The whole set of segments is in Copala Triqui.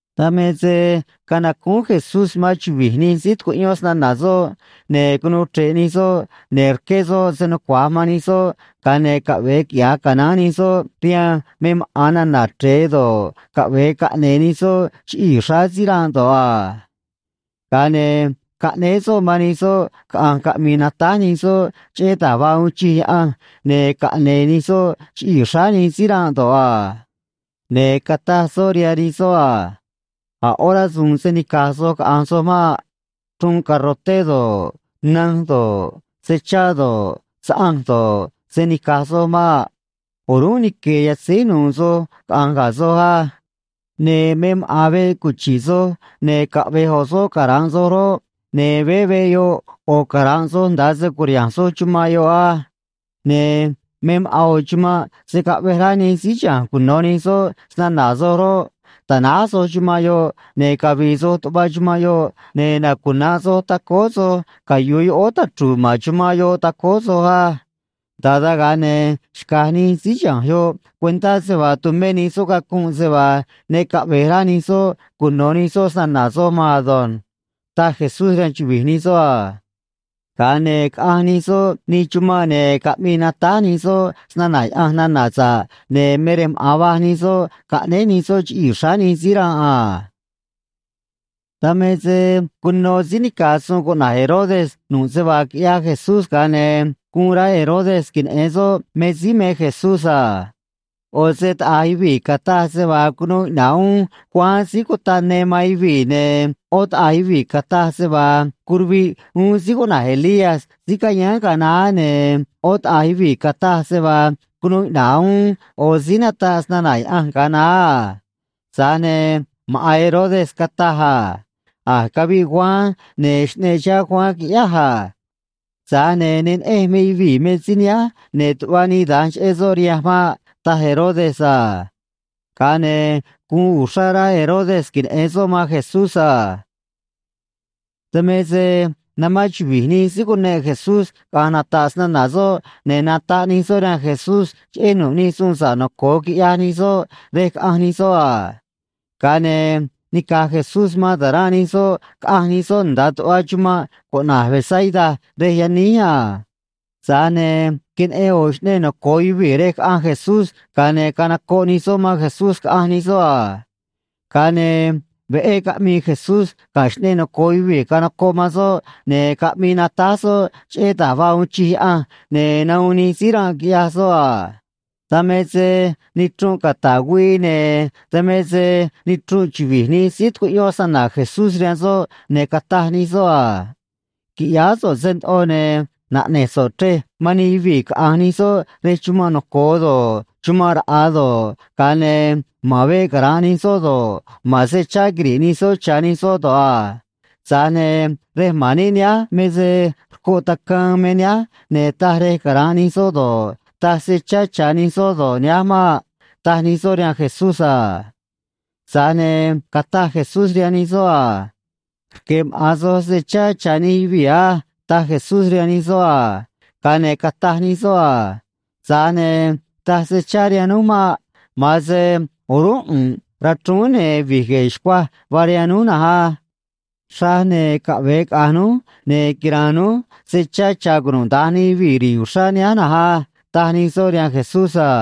Dan me se canacúún Jesús man chuvi̱j nij síí tucuꞌyón snana̱ soꞌ, ne̱ cunuu chre̱ꞌ nij soꞌ, ne̱ rqué soꞌ se nucua̱j man nij soꞌ, ga̱a ne̱ caꞌve̱e quiꞌya̱j canaán nij soꞌ rihaan me maꞌa̱n nana̱ chre̱e do̱ꞌ, caꞌve̱e caꞌne̱e̱ nij soꞌ chiꞌii̱ xráá síí ranꞌ do̱ꞌ a. Ga̱a ne̱ caꞌnéé soꞌ man nij soꞌ caꞌa̱nj caꞌmi̱i̱ natáj nij soꞌ cheꞌé da̱j vaa uun chij Yaꞌanj, ne caꞌne̱e̱ nij soꞌ chiꞌii̱ xráá nij síí ranꞌ do̱ꞌ a. Ne̱ cataj soꞌ rihaan nij soꞌ a: ―A̱ ꞌó rasu̱u̱n se̱ nica̱j soj caꞌa̱nj soj maꞌ. Chruun garroté do̱ꞌ, nanj do̱ꞌ, se chá do̱ꞌ, saꞌanj do̱ꞌ, se̱ nica̱j soj maꞌ. O̱rúnꞌ nique̱e̱ yatzéj nu̱u̱ soj caꞌa̱nj ga̱ soj á. Ne̱ me maꞌa̱n veꞌ cuchi̱ꞌ soj ne̱ caꞌvej ꞌo̱ soꞌ cara̱nꞌ soj roꞌ, ne̱ veé veꞌ yoꞌ ꞌo̱ cara̱nꞌ soj nda̱a se cu̱riha̱nj soj chumanꞌ yoꞌ á. Ne̱ me maꞌa̱n ꞌo̱ chumanꞌ se̱ caꞌvej rá nij síí chiha̱nj cuno̱ nij soꞌ snana̱ soj roꞌ, ta̱náj soj chumanꞌ yoꞌ, ne̱ cavi̱i̱ soj tuꞌva chumanꞌ yoꞌ, ne̱ nacuna̱nꞌ soj tacóó soj cayu̱u yoꞌóó tachru̱u̱ ma̱n chumanꞌ yoꞌ tacóó soj á. Nda̱a dan, ga̱a ne̱ xca̱j nij síí chiha̱nj yoꞌ cuentá se vaa tumé nij soꞌ cacunꞌ se vaa ne caꞌve̱j rá nij soꞌ cuno̱ nij soꞌ snana̱ soj maan ado̱nj ―taj Jesús rihaan chuvi̱j nij soꞌ a. Ga̱a ne̱ caꞌanj nij soꞌ nij chumanꞌ, ne̱ caꞌmii natáj nij soꞌ snana̱ Yaꞌanj nana̱ sa̱ꞌ, ne̱ me rej maꞌa̱n va̱j nij soꞌ caꞌnéj nij soꞌ chiꞌii̱ xráá nij síí ranꞌ a. Dan me se cuno síí nica̱j suun cuꞌna̱j Herodes nu̱ꞌ se vaa quiꞌyaj Jesús, ga̱a ne̱ guun rá Herodes queneꞌe̱n soꞌ me síí me Jesús a. ꞌO̱ se taꞌa̱j yuvii̱ cataj se vaa cunuu iꞌna̱ꞌ uún Juan Síí Cutaꞌ Ne man yuvii̱, ne̱ ꞌó taꞌa̱j yuvii̱ cataj se vaa curuviꞌ uún síí cuꞌna̱j Elías síí cayáán ga̱a naá, ne̱ ꞌó taꞌa̱j yuvii̱ cataj se vaa cunuu iꞌna̱ꞌ uún ꞌo̱ síí nataꞌ snana̱ Yaꞌanj ga̱a naá a. Tza̱j ne̱ maꞌa̱n Herodes cataj a: ―A̱j caviꞌ Juan, ne̱ xꞌneꞌ chihá Juan, quiꞌyáj a. Tza̱j ne̱ ne neꞌenj me yuvii̱ me síí nihánj, ne̱ tuꞌva nii da̱nj cheꞌé soꞌ rihanj maꞌ ―taj Herodes a. Ga̱a ne̱ guun uxrá rá Herodes queneꞌe̱n soꞌ man Jesús a. Dan me se namán chuvi̱j nij síí cuneꞌ Jesús caꞌa̱nj nata̱ꞌ snana̱ soꞌ, ne̱ nataꞌ nij soꞌ rihaan Jesús cheꞌé nu̱ꞌ nij suun sa̱ꞌ noco̱o quiꞌyaj nij soꞌ rej caꞌanj nij soꞌ a. Ga̱a ne̱ nica̱j Jesús man ta̱ranꞌ nij soꞌ, caꞌanj nij soꞌ nda̱a tuꞌva chumanꞌ cuꞌna̱j Betsaida rej yaníj a. Tza̱j ne̱ queneꞌen ꞌo̱ xꞌneꞌ noco̱o yuvii̱ rej caꞌanj Jesús, ga̱a ne̱ canocoꞌ nij soꞌ man Jesús, caꞌanj nij soꞌ a. Ga̱a ne̱ veꞌé caꞌmii Jesús ga̱ xꞌneꞌ noco̱o yuvii̱ canocoꞌ man soꞌ, ne̱ caꞌmii natáj soꞌ cheꞌé da̱j vaa uun chij Yaꞌanj, ne̱ nahuun nij síí ranꞌ, quiꞌyaj soꞌ a. Dan me se nichrunꞌ cata̱ꞌ güii, ne̱ dan me se nichrunꞌ chuvi̱j nij síí tucuꞌyón snana̱ Jesús rihaan soꞌ, ne̱ cataj nij soꞌ a: ―Qui̱ꞌyáá so̱ꞌ se ndoꞌo, ne̱ naꞌne̱j so̱ꞌ chrej man nij yuvii̱, caꞌa̱nj nij soꞌ rej chumanꞌ noco̱o do̱ꞌ, chumanꞌ raꞌa̱ do̱ꞌ, ga̱a ne̱ ma̱n veꞌ cara̱nꞌ nij soꞌ do̱ꞌ, ma̱n se chá quiri̱ꞌ nij soꞌ cha̱ nij soꞌ do̱ꞌ a. Tza̱j ne̱ rej ma̱n níꞌ nihánj me se rcoꞌ tacaan me nihánj, ne̱ taj rej cara̱nꞌ nij soꞌ do̱ꞌ, taj se chá cha̱ nij soꞌ do̱ꞌ, nihánj maꞌ ―taj nij soꞌ rihaan Jesús a. Tza̱j ne̱ cataj Jesús rihaan nij soꞌ a: ―Rque̱ maꞌa̱n soj se chá cha̱ nij yuvii̱ á ―taj Jesús rihaan nij soꞌ a. Ga̱a ne̱ cataj nij soꞌ a: ―Tza̱j ne̱ taj se chá rihaan núj maꞌ. Ma̱an se o̱rúnꞌ ꞌu̱nꞌ rachrúún ne̱ vi̱j gue̱e̱ xcuaj vaa rihaan núj na̱nj á. Xraj ne̱ caꞌve̱e caꞌa̱nj núj, ne̱ quira̱a̱n núj se chá cha̱ cunuda̱nj nij yuvii̱ ri̱i̱ uxrá nihánj na̱nj á ―taj nij soꞌ rihaan Jesús a.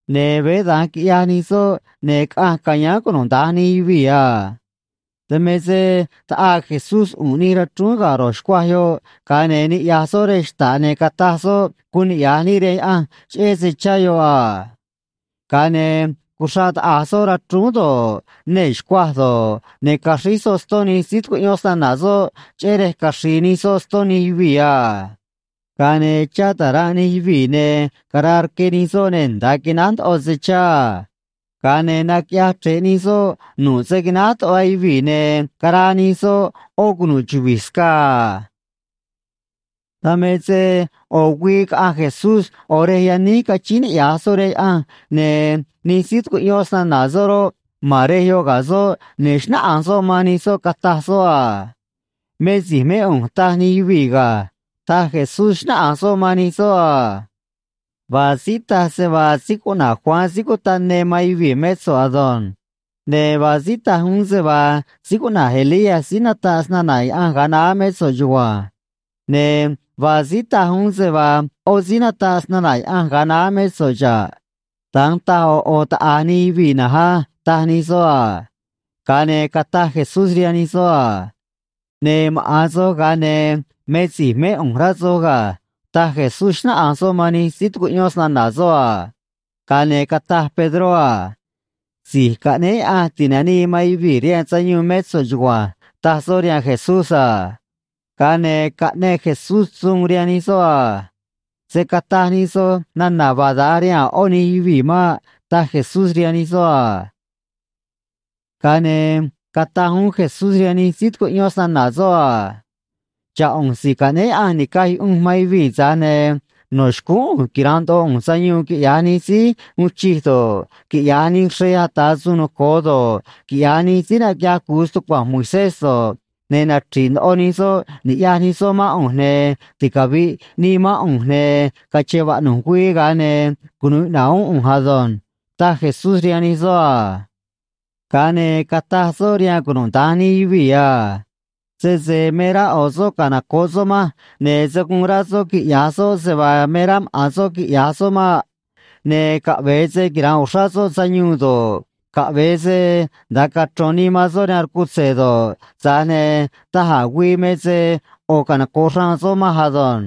Ne̱ veé da̱nj quiꞌyaj nij soꞌ, ne̱ caꞌanj ca̱yáán cunuda̱nj nij yuvii̱ a. Dan me se taꞌaa Jesús ꞌu̱nꞌ nij rachrúún ga̱ ro̱j xcuaj yoꞌ, ga̱a ne̱ niꞌya̱j soꞌ rej xta̱ꞌ, ne̱ cataj soꞌ guun niꞌya̱j níꞌ rihaan Yaꞌanj cheꞌé se chá yoꞌ a. Ga̱a ne̱ cuxraꞌ taꞌa̱j soꞌ rachrúún do̱ꞌ, nee̱ xcuaj do̱ꞌ, ne̱ caxríj soꞌ ston nij síí tucuꞌyón snana̱ soꞌ, cheꞌé rej caxri̱i̱ nij soꞌ ston nij yuvii̱ a. Ga̱a ne̱ chá ta̱ranꞌ nij yuvii̱, ne̱ caraa rque nij soꞌ ne̱ nda̱a quináj ndoꞌo se chá a. Ga̱a ne̱ naquiꞌyaj chre̱ꞌ nij soꞌ nu̱ꞌ se quináj tuꞌva yuvii̱, ne̱ caraa nij soꞌ ꞌó cunu̱ꞌ chuvi̱j scaa a. Dan me se ꞌo̱ güii caꞌanj Jesús ꞌo̱ rej yaníj cachíín niꞌya̱j soꞌ rihaan Yaꞌanj, ne̱ nij síí tucuꞌyón snana̱ soꞌ roꞌ, ma̱n rej yoꞌ ga̱ soꞌ, ne̱ xnáꞌanj soꞌ man nij soꞌ, cataj soꞌ a: ―Me si̱j mé ꞌu̱nj, taj nij yuvii̱ ga̱ ―taj Jesús, xnáꞌanj soꞌ man nij soꞌ a. ―Vaa síí taj se vaa síí cuꞌna̱j Juan Síí Cutaꞌ Ne man yuvii̱ mé so̱ꞌ ado̱nj. Ne̱ vaa síí taj uún se vaa síí cuꞌna̱j Elías síí nataꞌ snana̱ Yaꞌanj ga̱a naá mé so̱ꞌ chugua̱nj. Ne̱ vaa síí taj uún se vaa ꞌó síí nataꞌ snana̱ Yaꞌanj ga̱a naá mé so̱ꞌ xa̱ꞌ. Da̱nj taj ꞌo̱ ꞌo̱ taꞌa̱j nij yuvii̱ na̱nj á ―taj nij soꞌ a. Ga̱a ne̱ cataj Jesús rihaan nij soꞌ a: ―Ne̱ maꞌa̱n soj, ga̱a ne̱ me si̱j mé ꞌu̱nj, rá soj ga̱ ―taj Jesús, xnáꞌanj soꞌ man nij síí tucuꞌyón snana̱ soꞌ a. Ga̱a ne̱ cataj Pedró a: ―Si̱j Caꞌnéé Yaꞌanj Ti̱nanii man Yuvii̱ rihaan Sayuun mé so̱ꞌ chugua̱nj ―taj soꞌ rihaan Jesús a. Ga̱a ne̱ caꞌneꞌ Jesús suun rihaan nij soꞌ a: ―Se̱ cataj nij soj nana̱ vaa da̱nj rihaan a̱ ꞌó nij yuvii̱ maꞌ ―taj Jesús rihaan nij soꞌ a. Ga̱a ne̱ cataj uún Jesús rihaan nij síí tucuꞌyón snana̱ soꞌ a: ―Xa̱ꞌ ꞌu̱nj Si̱j Caꞌnéé Yaꞌanj Ni̱caj Yuꞌunj man Yuvii̱, tza̱j ne̱ no̱ xcúún ꞌu̱nj quira̱nꞌ ndoꞌo ꞌu̱nj sayuun quiꞌya̱j nij síí uun chij do̱ꞌ, quiꞌya̱j nij xrej ata̱ suun noco̱o do̱ꞌ, quiꞌya̱j nij síí naquiꞌyaj cu̱u stucua̱nj Moisés do̱ꞌ, ne̱ nachri̱ꞌ ndoꞌo nij soꞌ ni̱ꞌyaj nij soꞌ mán ꞌu̱nj, ne̱ ticavi̱ꞌ nii mán ꞌu̱nj, ne̱ cache̱n vaꞌnu̱j güii, ga̱a ne̱ cunu̱u iꞌna̱ꞌ uún ꞌu̱nj ado̱nj ―taj Jesús rihaan nij soꞌ a. Ga̱a ne̱ cataj soꞌ rihaan cunuda̱nj nij yuvii̱ a: ―Sese me rá ꞌo̱ soꞌ canoco̱ꞌ soꞌ manj, ne̱ se̱ guun rá soꞌ quiꞌya̱j soꞌ se vaa me rá maꞌa̱n soꞌ quiꞌya̱j soꞌ maꞌ. Ne̱ caꞌve̱e se quira̱nꞌ uxrá soꞌ sayuun do̱ꞌ, caꞌve̱e se nda̱a cachro̱n nii man soꞌ rihaan rcutze̱ do̱ꞌ, tza̱j ne̱ da̱j a̱ güii me se ꞌo̱ canoco̱ꞌ xraan soꞌ manj ado̱nj.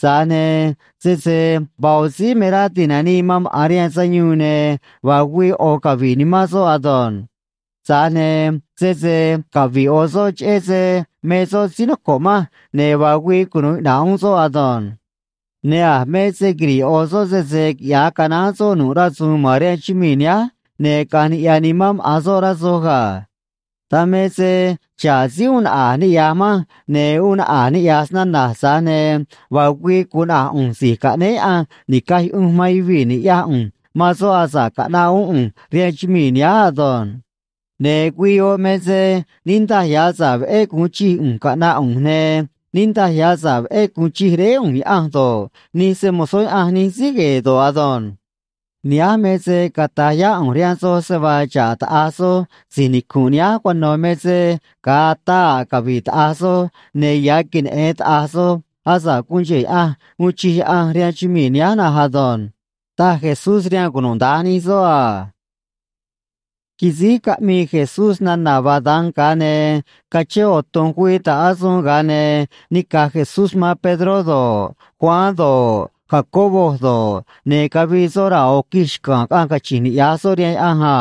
Tza̱j ne̱ sese vaa ꞌo̱ síí me rá ti̱nanii man maꞌa̱n rihaan sayuun, ne̱ vaa güii ꞌo̱ cavi̱ꞌ nimán soꞌ ado̱nj. Tza̱j ne̱ sese cavi̱ꞌ ꞌo̱ soꞌ cheꞌé se me soꞌ síí noco̱ꞌ manj, ne̱ vaa güii cunu̱u iꞌna̱ꞌ uún soꞌ ado̱nj. Ne̱ a̱ me se quiri̱ꞌ ꞌo̱ soꞌ sese quiꞌya̱j canaán soꞌ nu̱ꞌ rasu̱u̱n ma̱n rihaan chumii̱ nihánj, ne̱ caꞌa̱nj niꞌya̱ nimán maꞌa̱n soꞌ, rá soj ga̱. Dan me se xa̱ꞌ síí uun naꞌa̱j niꞌya̱j manj ne̱ uun naꞌa̱j niꞌya̱j snana̱j, tza̱j ne̱ vaa güii gu̱un naꞌa̱j ꞌu̱nj Si̱j Caꞌnéé Yaꞌanj Ni̱caj Yuꞌunj man Yuvii̱ ni̱ꞌyaj ꞌu̱nj man soꞌ asa̱ꞌ caꞌnaꞌ uún ꞌu̱nj rihaan chumii̱ nihánj ado̱nj. Ne̱ güii yoꞌ me se niꞌndaj ya̱ sa̱ꞌ veꞌé gu̱un chij ꞌu̱nj caꞌna̱ꞌ ꞌu̱nj, ne̱ niꞌndaj ya̱ sa̱ꞌ veꞌé gu̱un chij Réé ꞌu̱nj Yaꞌanj do̱ꞌ, nij se‑mo̱zó Yaꞌanj nij síí gue̱e̱ do̱ꞌ ado̱nj. Nihánj me se cata̱j yá ꞌu̱nj rihaan soj se vaa xa̱ꞌ taꞌa̱j soj si̱j nicu̱nꞌ nihánj cuano̱ me se ga̱a ataa a̱ cavi̱ꞌ taꞌa̱j soj, ne̱ ya̱ queneꞌe̱n taꞌa̱j soj asa̱ꞌ guun cheꞌe̱ Yaꞌanj uun chij Yaꞌanj rihaan chumii̱ nihánj na̱nj ado̱nj ―taj Jesús rihaan cunuda̱nj nij soꞌ a. Quisíj caꞌmii Jesús nana̱ vaa da̱nj, ga̱a ne̱ cachén ꞌo̱ tu̱nj güii ta̱ꞌ asuun, ga̱a ne̱ nica̱j Jesús man Pedró do̱ꞌ, Juan do̱ꞌ, Jacobo do̱ꞌ, ne̱ cavii soꞌ raa̱ ꞌo̱ quij xca̱a̱n, caꞌanj cachi̱nj niꞌya̱j soꞌ rihaan Yaꞌanj a.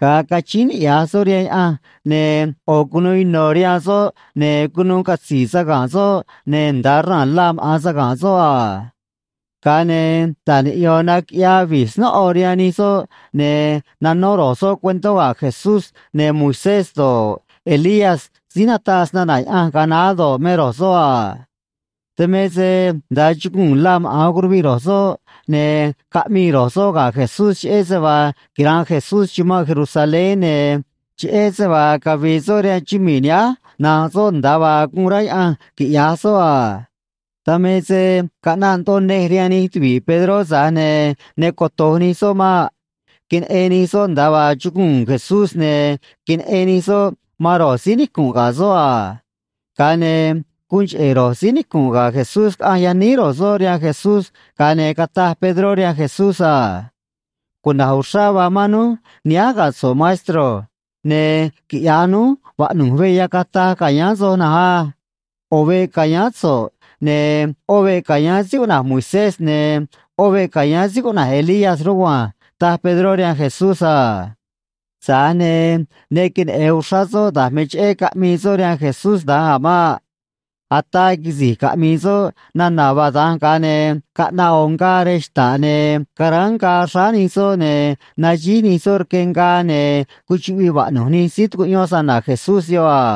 Ga̱a cachíín niꞌya̱j soꞌ rihaan Yaꞌanj, ne̱ ꞌo̱ cunuu ino̱ rihaan soꞌ, ne̱ cunuu catzi̱i̱ saga̱nꞌ soꞌ, ne̱ nda̱a raa̱n la maꞌa̱n saga̱nꞌ soꞌ a. Ga̱a ne̱ ta̱j niꞌyo̱n naquiꞌyaa vi̱j snóꞌo rihaan nij soꞌ, ne̱ nanó ro̱j soꞌ cuentó ga̱ Jesús, ne̱ Moisés do̱ꞌ, Elías síí nataꞌ snana̱ Yaꞌanj ga̱a naá do̱ꞌ, me ro̱j soꞌ a. Dan me se nda̱a chuguu̱n la maꞌa̱n curuviꞌ ro̱j soꞌ, ne̱ caꞌmii ro̱j soꞌ ga̱ Jesús cheꞌé se vaa quira̱nꞌ Jesús chumanꞌ Jerusalén, ne̱ cheꞌé se vaa cavi̱i̱ soꞌ rihaan chumii̱ nihánj nanꞌ soꞌ, nda̱a vaa guun rá Yaꞌanj quiꞌya̱j soꞌ a. Dan me se caꞌnaꞌ ndoꞌo nej rihaan nij tuvi̱ꞌ Pedró, tza̱j ne̱ ne coto̱j nij soꞌ maꞌ. Queneꞌen nij soꞌ nda̱a vaa chuguu̱n Jesús, ne̱ queneꞌen nij soꞌ man ro̱j síí nicu̱nꞌ ga̱ soꞌ a. Ga̱a ne̱ guun cheꞌe̱ ro̱j síí nicu̱nꞌ ga̱ Jesús caꞌanj yaníj ro̱j soꞌ rihaan Jesús, ga̱a ne̱ cataj Pedró rihaan Jesús a: ―Cuna̱j uxrá vaa mán núj nihánj ga̱ so̱ꞌ, maestro. Ne̱ quiꞌya̱j núj vaꞌnu̱j veꞌ yacataj ca̱yáán soj na̱nj á. ꞌO̱ veꞌ ca̱yáán so̱ꞌ, ne̱ ꞌó veꞌ ca̱yáán síí cuꞌna̱j Moisés, ne̱ ꞌó veꞌ ca̱yáán síí cuꞌna̱j Elías rugua̱nj ―taj Pedró rihaan Jesús a. Tza̱j ne̱ ne queneꞌe̱n uxrá soꞌ da̱j me cheꞌé caꞌmii soꞌ rihaan Jesús da̱nj a̱ maꞌ. Ataa quisi̱j caꞌmii soꞌ nana̱ vaa da̱nj, ga̱a ne̱ caꞌnaꞌ ꞌo̱ ngaa rej xta̱ꞌ, ne̱ caráán ngaa xráá nij soꞌ ne̱ naxíj nij soꞌ rque ngaa, ne̱ cuchuꞌviꞌ vaꞌnu̱j nij síí tucuꞌyón snana̱ Jesús yoꞌ a.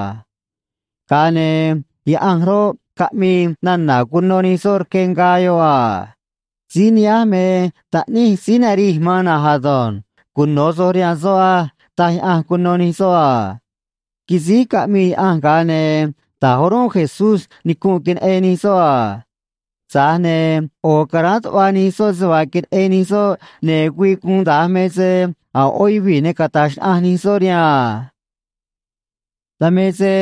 Ga̱a ne̱ Yaꞌanj roꞌ, caꞌmii nana̱ cuno nij soꞌ rque ngaa yoꞌ a. ―Síí nihánj me Taꞌníj síí narij man na̱nj ado̱nj. Cuno̱ soj rihaan soꞌ á ―taj Yaꞌanj cuno nij soꞌ a. Quisíj caꞌmii Yaꞌanj, ga̱a ne̱ ta̱j o̱rúnꞌ Jesús nicunꞌ, queneꞌen nij soꞌ a. Tza̱j ne̱ ꞌo̱ caráán tuꞌva nij soꞌ se vaa queneꞌen nij soꞌ, ne̱ güii guun da̱nj me se a̱ ꞌó yuvii̱ ne cata̱j xnaꞌanj nij soꞌ rihaan a. Dan me se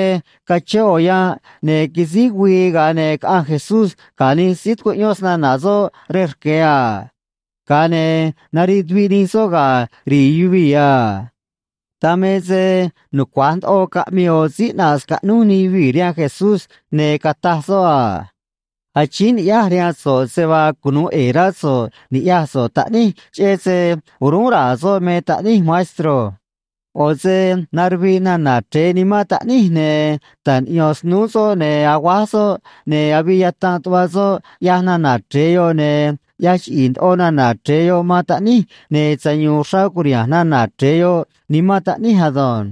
cachén ꞌo̱ yanꞌ, ne̱ quisíj güii, ga̱a ne̱ caꞌanj Jesús ga̱ nij síí tucuꞌyón snana̱ soꞌ rej rque̱ a. Ga̱a ne̱ nariꞌ tuviꞌ nij soꞌ ga̱ ri̱i̱ yuvii̱ a. Dan me se nucua̱j ndoꞌo caꞌmii ꞌo̱ síí ꞌnaꞌ scaꞌnúj nij yuvii̱ rihaan Jesús, ne̱ cataj soꞌ a: ―Achíín ni̱ꞌyáj rihaan so̱ꞌ se vaa cunu̱u ꞌe̱e̱ rá so̱ꞌ ni̱ꞌyaj so̱ꞌ taꞌníj cheꞌé se o̱rúnꞌ ra̱a̱ soꞌ me taꞌníj, maestro. ꞌO̱ se naruviꞌ nana̱ chre̱e nimán taꞌníj, ne̱ ta̱j niꞌyo̱n snúú soꞌ, ne̱ aguáj soꞌ, ne̱ avii yatanꞌ tuꞌva soꞌ, ꞌyaj nana̱ chre̱e yoꞌ, ne̱ ꞌyaj chiꞌi̱i̱ ndoꞌo nana̱ chre̱e yoꞌ man taꞌníj, ne̱ sayu̱u̱n uxrá cu̱riha̱nj nana̱ chre̱e yoꞌ nimán taꞌníj ado̱nj.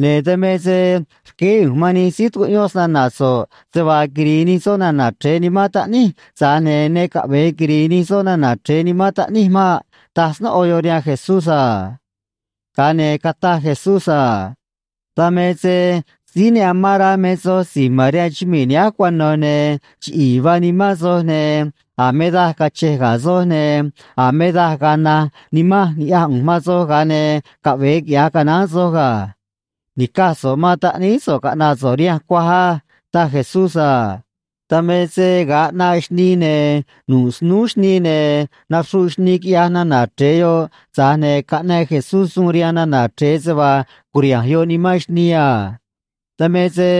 Ne̱ dan me se rqueé ꞌu̱nj man nij síí tucuꞌyón snana̱ so̱ꞌ se vaa quiri̱i̱ nij soꞌ nana̱ chre̱e nimán taꞌníj, tza̱j ne̱ ne caꞌve̱e quiri̱i̱ nij soꞌ nana̱ chre̱e nimán taꞌníj maꞌ ―taj snóꞌo yoꞌ rihaan Jesús a. Ga̱a ne̱ cataj Jesús a: ―Dan me se síí ne amán rá me soj si̱j ma̱n rihaan chumii̱ nihánj cuano̱, ne̱ chiꞌi̱i̱ vaa nimán soj, ne̱ a̱ me daj cache̱j ga̱ soj, ne̱ a̱ me daj ga̱a̱ naj nimanj ni̱ꞌyaj ꞌu̱nj man soj, ga̱a ne̱ caꞌve̱e quiꞌya̱j canaán soj ga̱. Ni̱caj so̱ꞌ man taꞌníí so̱ꞌ caꞌna̱ꞌ so̱ꞌ rihanj cuaj á ―taj Jesús a. Dan me se ga̱a ꞌnaꞌ xnii, ne̱ nu̱ꞌ snúú xnii, ne̱ naxruꞌ xnii, quiꞌyaj nana̱ chre̱e yoꞌ, tza̱j ne̱ caꞌneꞌ Jesús suun rihaan nana̱ chre̱e se vaa cu̱riha̱nj yoꞌ nimán xnii a. Dan me se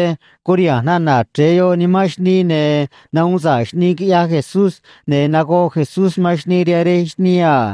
curiha̱nj nana̱ chre̱e yoꞌ nimán xnii, ne̱ nahuun sa̱ꞌ xnii, quiꞌyaj Jesús, ne̱ nagoꞌ Jesús man xnii rihaan rej xnii a.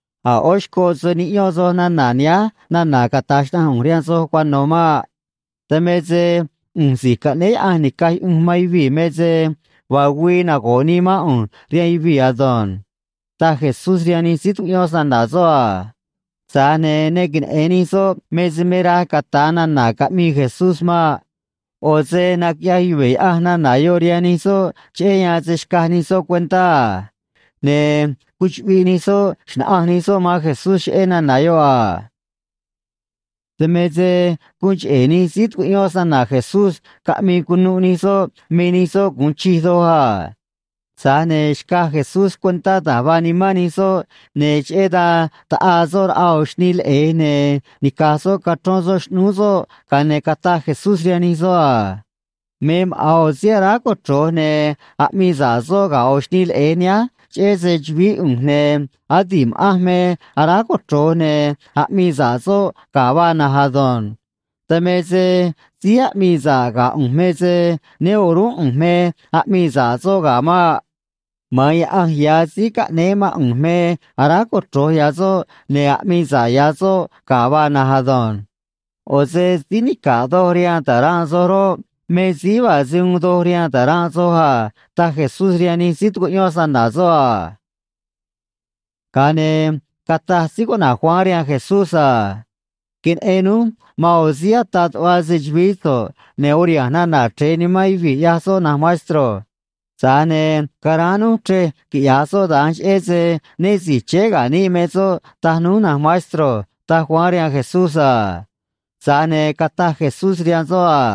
―A̱ ꞌó xcoꞌ se̱ niꞌyón soj nana̱ nihánj nana̱ cata̱j xnaꞌanj ꞌu̱nj rihaan soj cuano̱ maꞌ. Dan me se ꞌu̱nj Si̱j Caꞌnéé Yaꞌanj Ni̱caj Yuꞌunj man Yuvii̱ me se vaa güii nago̱ꞌ nii mán ꞌu̱nj rihaan yuvii̱ ado̱nj ―taj Jesús rihaan nij síí tucuꞌyón snana̱ soꞌ a. Tza̱j ne̱ ne queneꞌe̱n nij soꞌ me se me raj cata̱a nana̱ caꞌmii Jesús maꞌ. ꞌO̱ se naquiꞌyaj yuve̱ Yaꞌanj nana̱ yoꞌ rihaan nij soꞌ cheꞌé yan se̱ xcaj nij soꞌ cuentá a. Ne̱ cuchuꞌviꞌ nij soꞌ xna̱ꞌanj nij soꞌ man Jesús cheꞌé nana̱ yoꞌ a. Dan me se guun cheꞌe̱ nij síí tucuꞌyón snana̱ Jesús caꞌmii cunuꞌ nij soꞌ me nij soꞌ gu̱un chij doj a. Tza̱j ne̱ xcaj Jesús cuentá da̱j vaa nimán nij soꞌ, ne̱ cheꞌé dan taꞌaa soꞌ raꞌa ꞌo̱ xnii leꞌe̱j, ne̱ nica̱j soꞌ cachrón soꞌ xꞌnúú soꞌ, ga̱a ne̱ cataj Jesús rihaan nij soꞌ a: ―Me maꞌa̱n ꞌo̱ síí aráj cochro̱j ne̱ aꞌmii sa̱ꞌ soꞌ ga̱ ꞌo̱ xnii leꞌe̱j nihánj cheꞌé se‑chu̱vií ꞌu̱nj, ne̱ adi̱ꞌ ma̱ꞌanj me aráj cochro̱j ne̱ aꞌmii sa̱ꞌ soꞌ ga̱ vaa na̱nj ado̱nj. Dan me se síí aꞌmii sa̱ꞌ ga̱ ꞌu̱nj me se né o̱rúnꞌ ꞌu̱nj me aꞌmii sa̱ꞌ soꞌ ga̱ maꞌ. Ma̱an Yaꞌanj ya̱ síí caꞌnéé mán ꞌu̱nj me aráj cochro̱j ya̱ soꞌ ne̱ aꞌmii sa̱ꞌ ya̱ soꞌ ga̱ vaa na̱nj ado̱nj. ꞌO̱ se síí nica̱ꞌ doj rihaan ta̱ranꞌ soj roꞌ, me síí vaa se uun doj rihaan ta̱ranꞌ soj a ―taj Jesús rihaan nij síí tucuꞌyón snana̱ soꞌ a. Ga̱a ne̱ cataj síí cuꞌna̱j Juan rihaan Jesús a: ―Queneꞌen núj man ꞌo̱ síí ataꞌ tuꞌva se‑chu̱vií so̱ꞌ, ne̱ uriha̱nj nana̱ chre̱e nimán yuvii̱, ꞌyaj soꞌ, na̱nj maestro. Tza̱j ne̱ caráán núj chrej quiꞌya̱j soꞌ da̱nj, cheꞌé se né si̱j chéé ga̱ níꞌ me soꞌ, taj núj, na̱nj maestro ―taj Juan rihaan Jesús a. Tza̱j ne̱ cataj Jesús rihaan soꞌ a: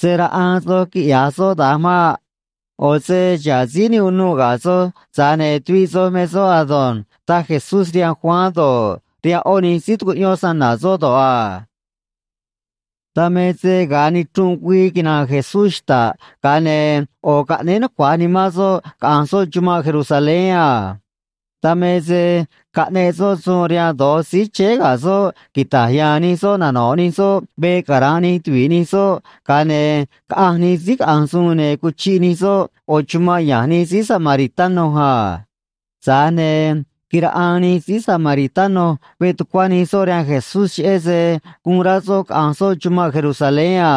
―Se̱ raꞌaan soj quiꞌya̱j soꞌ da̱nj maꞌ. ꞌO̱ se xa̱ꞌ síí ne unuꞌ ga̱ soj, tza̱j ne̱ tuviꞌ soj me soꞌ ado̱nj ―taj Jesús rihaan Juan do̱ꞌ, rihaan ꞌó nij síí tucuꞌyón snana̱ soꞌ do̱ꞌ a. Dan me se ga̱a nichrunꞌ güii quina̱nꞌ Jesús xta̱ꞌ, ga̱a ne̱ ꞌo̱ caꞌnéé nucua̱j nimán soꞌ caꞌa̱nj soꞌ chumanꞌ Jerusalén a. Dan me se caꞌneꞌ soꞌ suun rihaan do̱j síí chéé ga̱ soꞌ quita̱j ya̱a̱n nij soꞌ nano̱ꞌ nij soꞌ veꞌ cara̱nꞌ nij tuvi̱ꞌ nij soꞌ, ga̱a ne̱ caꞌanj nij síí caꞌanj suun, ne̱ cuchiꞌ nij soꞌ ꞌo̱ chumanꞌ ya̱nj nij síí samaritano a. Tza̱j ne̱ quiraꞌaan nij síí samaritano veꞌ tucuá nij soꞌ rihaan Jesús, cheꞌé se guun rá soꞌ caꞌa̱nj soꞌ chumanꞌ Jerusalén a.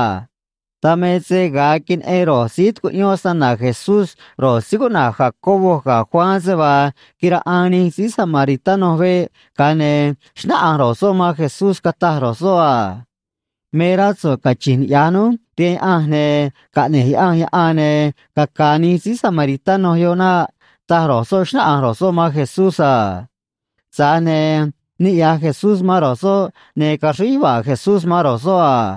Dan me se ga̱a queneꞌen ro̱j síí tucuꞌyón snana̱ Jesús ro̱j síí cuꞌna̱j Jacobo ga̱ Juan, se vaa quiraꞌaan nij síí samaritano veꞌ, ga̱a ne̱ xnáꞌanj ro̱j soꞌ man Jesús, cataj ro̱j soꞌ a: ―Me rá so̱ꞌ cachi̱nj niꞌya̱j núj rihaan Yaꞌanj, ne̱ caꞌne̱j Yaꞌanj yaꞌan, ne̱ caca̱a̱ nij síí samaritano yoꞌ naꞌ ―taj ro̱j soꞌ, xnáꞌanj ro̱j soꞌ man Jesús a. Tza̱j ne̱ niꞌya̱j Jesús man ro̱j soꞌ, ne̱ caxríj yuva̱a̱ Jesús man ro̱j soꞌ a.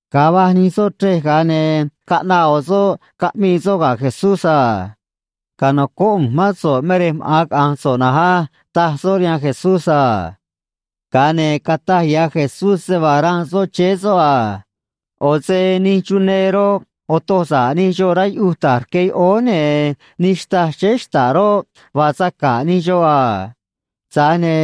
Ga̱a va̱j nij soꞌ chrej, ga̱a ne̱ caꞌnaꞌ ꞌo̱ soꞌ, caꞌmii soꞌ ga̱ Jesús a: ―Ca̱nocóꞌ ꞌu̱nj mán so̱ꞌ me rej maꞌa̱n caꞌa̱nj so̱ꞌ na̱nj á ―taj soꞌ rihaan Jesús a. Ga̱a ne̱ cataj ya̱ Jesús se vaa ranꞌ soꞌ chéé soꞌ a: ―ꞌO̱ se nij chunee roꞌ, otoj sa̱ꞌ nij xoꞌ rá yuꞌuj ta̱j rque yoꞌóó, ne̱ nij xtâj chéé xta̱ꞌ roꞌ, vaa saca̱ꞌ nij xoꞌ a. Tza̱j ne̱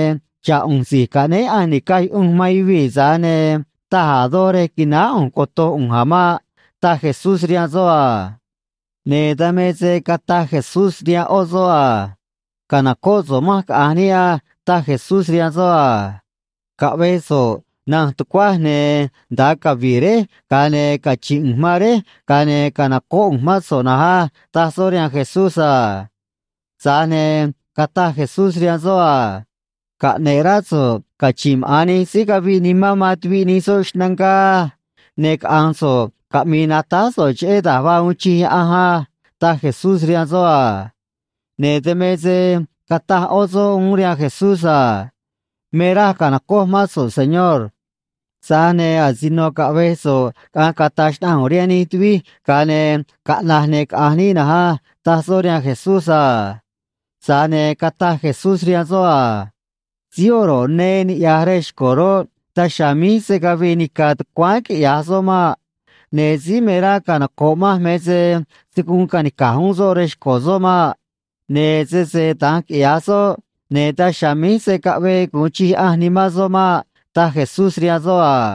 xa̱ꞌ ꞌu̱nj Si̱j Caꞌnéé Yaꞌanj Ni̱caj Yuꞌunj man Yuvii̱, tza̱j ne̱ taj a̱ doj rej qui̱náá ꞌu̱nj coto̱j ꞌu̱nj a̱ maꞌ ―taj Jesús rihaan soꞌ a. Ne̱ dan me se cataj Jesús rihaan ꞌó soꞌ a: ―Ca̱nocóꞌ so̱ꞌ manj caꞌa̱nj níꞌ á ―taj Jesús rihaan soꞌ a. ―Caꞌve̱j so̱ꞌ nanj tucuaj, ne̱ nda̱a cavi̱ꞌ réj, ga̱a ne̱ cachi̱nꞌ ꞌu̱nj man réj, ga̱a ne̱ ca̱nocóꞌ ꞌu̱nj mán so̱ꞌ na̱nj á ―taj soꞌ rihaan Jesús a. Tza̱j ne̱ cataj Jesús rihaan soꞌ a: ―Caꞌne̱ꞌ rá so̱ꞌ cachi̱nꞌ maꞌa̱n nij síí caviꞌ nimán man tuviꞌ soꞌ xnangá á. Ne̱ caꞌa̱nj so̱ꞌ, caꞌmi̱i̱ natáj so̱ꞌ cheꞌé da̱j vaa uun chij Yaꞌanj á ―taj Jesús rihaan soꞌ a. Ne̱ dan me se cataj ꞌó soꞌ uún rihaan Jesús a: ―Me raj ca̱nocoj mán so̱ꞌ, Señor. Tza̱j ne̱ asino caꞌve̱j so̱ꞌ caꞌa̱nj cata̱j xnaꞌanj ꞌu̱nj rihaan nij tuvij, ga̱a ne̱ caꞌna̱j, ne̱ caꞌa̱nj níꞌ na̱nj á ―taj soꞌ rihaan Jesús a. Tza̱j ne̱ cataj Jesús rihaan soꞌ a: ―Síí oro̱ꞌ nee niꞌya̱j rej xco̱ roꞌ, daj chiha̱a̱ míj se̱ cavii nica̱ tucuáán quiꞌya̱j soꞌ maꞌ. Ne̱ síí me rá canoco̱ꞌ manj me se se̱ guun ca̱nica̱j uún soꞌ rej xco̱ soꞌ maꞌ. Ne̱ sese da̱nj quiꞌya̱j soꞌ, ne̱ daj chiha̱a̱ míj se̱ caꞌvee gu̱un chij Yaꞌanj nimán soꞌ maꞌ ―taj Jesús rihaan soꞌ a.